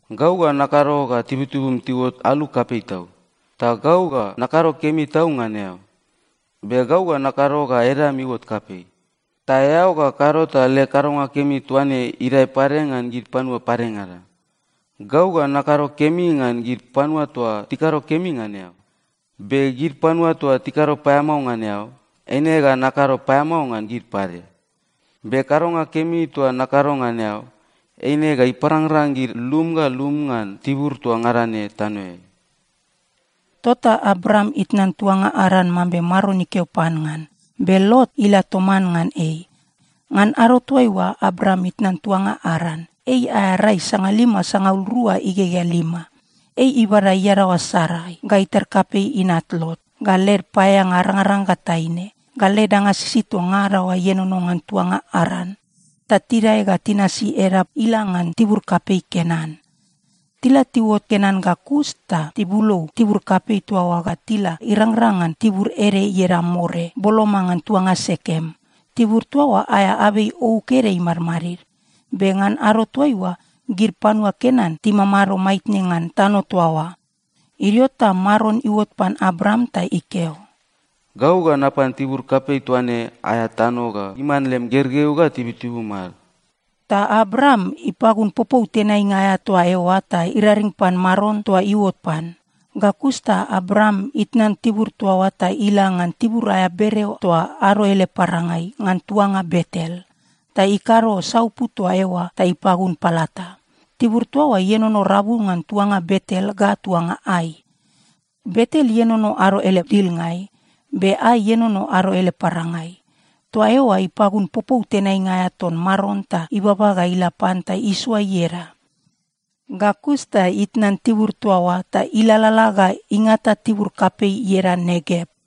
“Gau ga nakado ga tibutibum tiuot alu kapei tau, ta gau ga nakado kemi tau ngan eao. Be gau ga nakado ga edam iuot kapei. Ta eao ga kado ta leg kadonga kemi toa ne idae pade ngan gid panua padengada. Gau ga nakado kemi ngan gid panua toa tikado kemi ngan eao, be gid panua toa tikado paeamao ngan eao, eine ga nakado paeamao ngan gid pade. Be kadonga kemi toa nakado ngan eao, eine ga iparangrang gid lum ga lum ngan tibur toa ngada ne tanoeai.” Tota Abram itnan tuanga Aran, mambe Maron ikeo pan ngan, be Lot ila toman ngan ei. Ngan ado toaiua Abram itnan tuanga Aran, ei aea rai sangalima sangaul rua igegea lima. Ei ibada iadaoa Sarai, ga itar kapei inat Lot, ga led paeaeanga arangaranga ga taine, ga led danga sisid toa ngada oa ienono ngan tuanga Aran. Ta tidae ga tinasi edap ila ngan tibur kapei Kenan. Tila tiuot Kenan ga kus ta tibulou tibur kapei toa oa ga tila irangrang ngan tibur ede ieda More, boloma ngan tuanga Sekem. Tibur toa oa aea abei ouk ede imadmadid. Be ngan ado toaiua, gid panua Kenan timamado maitne ngan tano toa oa. Idio ta Maron iuot pan Abram ta ikeo, “Gau ga napan tibur kapei toa ne aea tano ga iman lem gergeu ga tibutibum ad.” Ta Abram ipagun popou tenainga aea toa eoa ta iraring pan Maron toa iuot pan. Ga kus ta Abram itnan tibur toa oa ta ila ngan tibur aea bereo toa ado ele parangai ngan tuanga Betel. Ta ikado saupu toa eoa ta ipagun palata. Tibur toa oa ienono rabu ngan tuanga Betel ga tuanga Ai. Betel ienono ado ele dilngai, be Ai ienono ado ele parangai. Toa eoa ipagun popou tenainga aea ton Maron ta ibaba ga ila pan ta isoa ieda. Ga kus ta itnan tibur toa oa ta ilalala ga ingata tibur kapei ieda Negev.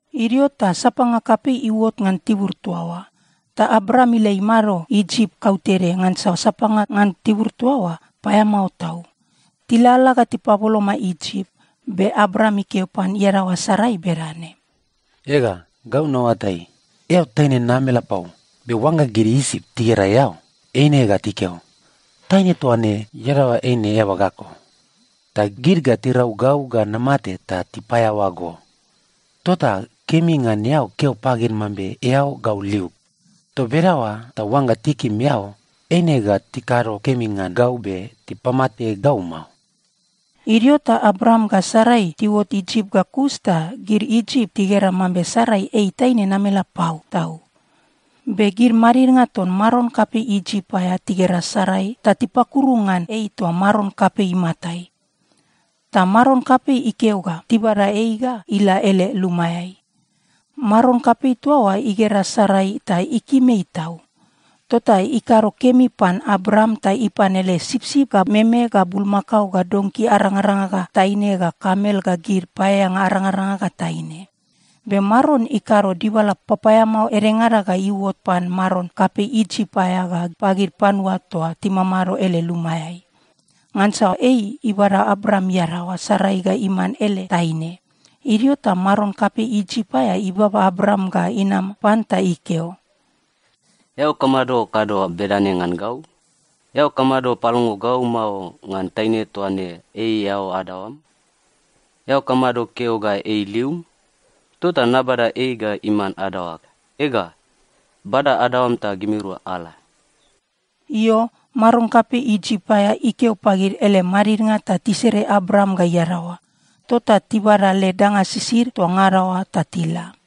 Idio ta sapanga kapei iuot ngan tibur toa oa, ta Abram ila imado Isip kautede, ngansa sapanga ngan tibur toa oa paeamao tau. Tilalala ga tipaboloma Isip, be Abram ikeo pan iadaoa Sarai bedane, “Ega, gau naoatai, eao taine namelapau. Be oangga gid Isip tigera eao, eine ga tikeo, ‘Taine toa ne iadaoa eine eaba ga eko.’ Ta gid ga tirau gau ga namate ta tipaeaoa go. Tota kemi ngan eao keo pagid mambe eao gau liug. Toa bedaoa ta oangga tikim eao, eine ga tikado kemi ngan gau be tipamate gau mao.” Idio ta Abram ga Sarai tiuot Isip ga kus ta gid Isip tigera mambe Sarai ei taine namelapau tau. Be gid madidnga ton maron kapei Isip aea tigera Sarai ta tipakuru ngan ei toa maron kapei imatai. Ta maron kapei ikeo ga tibada ei ga ila ele lumaeai. Maron kapei toa oa igera Sarai ta ikim ei tau. Tota ikado kemi pan Abram ta ipan ele sipsip ga meme ga bulmakao ga donki arangaranga ga taine ga kamel ga gid paeaeanga arangaranga ga taine. Be Maron ikado dibala papaeamao edengada ga iuot pan maron kapei Isip aea ga pagid panua toa timamado ele lumaeai. Ngansa ei ibada Abram iadaoa Sarai ga iman ele taine. Idio ta maron kapei Isip aea ibaba Abram ga inam pan ta ikeo, “Eao kamado kado bedane ngan gau? Eao kamado palongo gau mao ngan taine toa ne ei eao adaoam? Eao kamado keo ga ei lium? Tota nabada ei ga iman adaoag. Ega, bada adaoam ta gimirua ala!” Io, maron kapei Isip aea ikeo pagid ele madidnga ta tisere Abram ga iadaoa. Tota tibada led danga sisid toa ngada oa ta tila.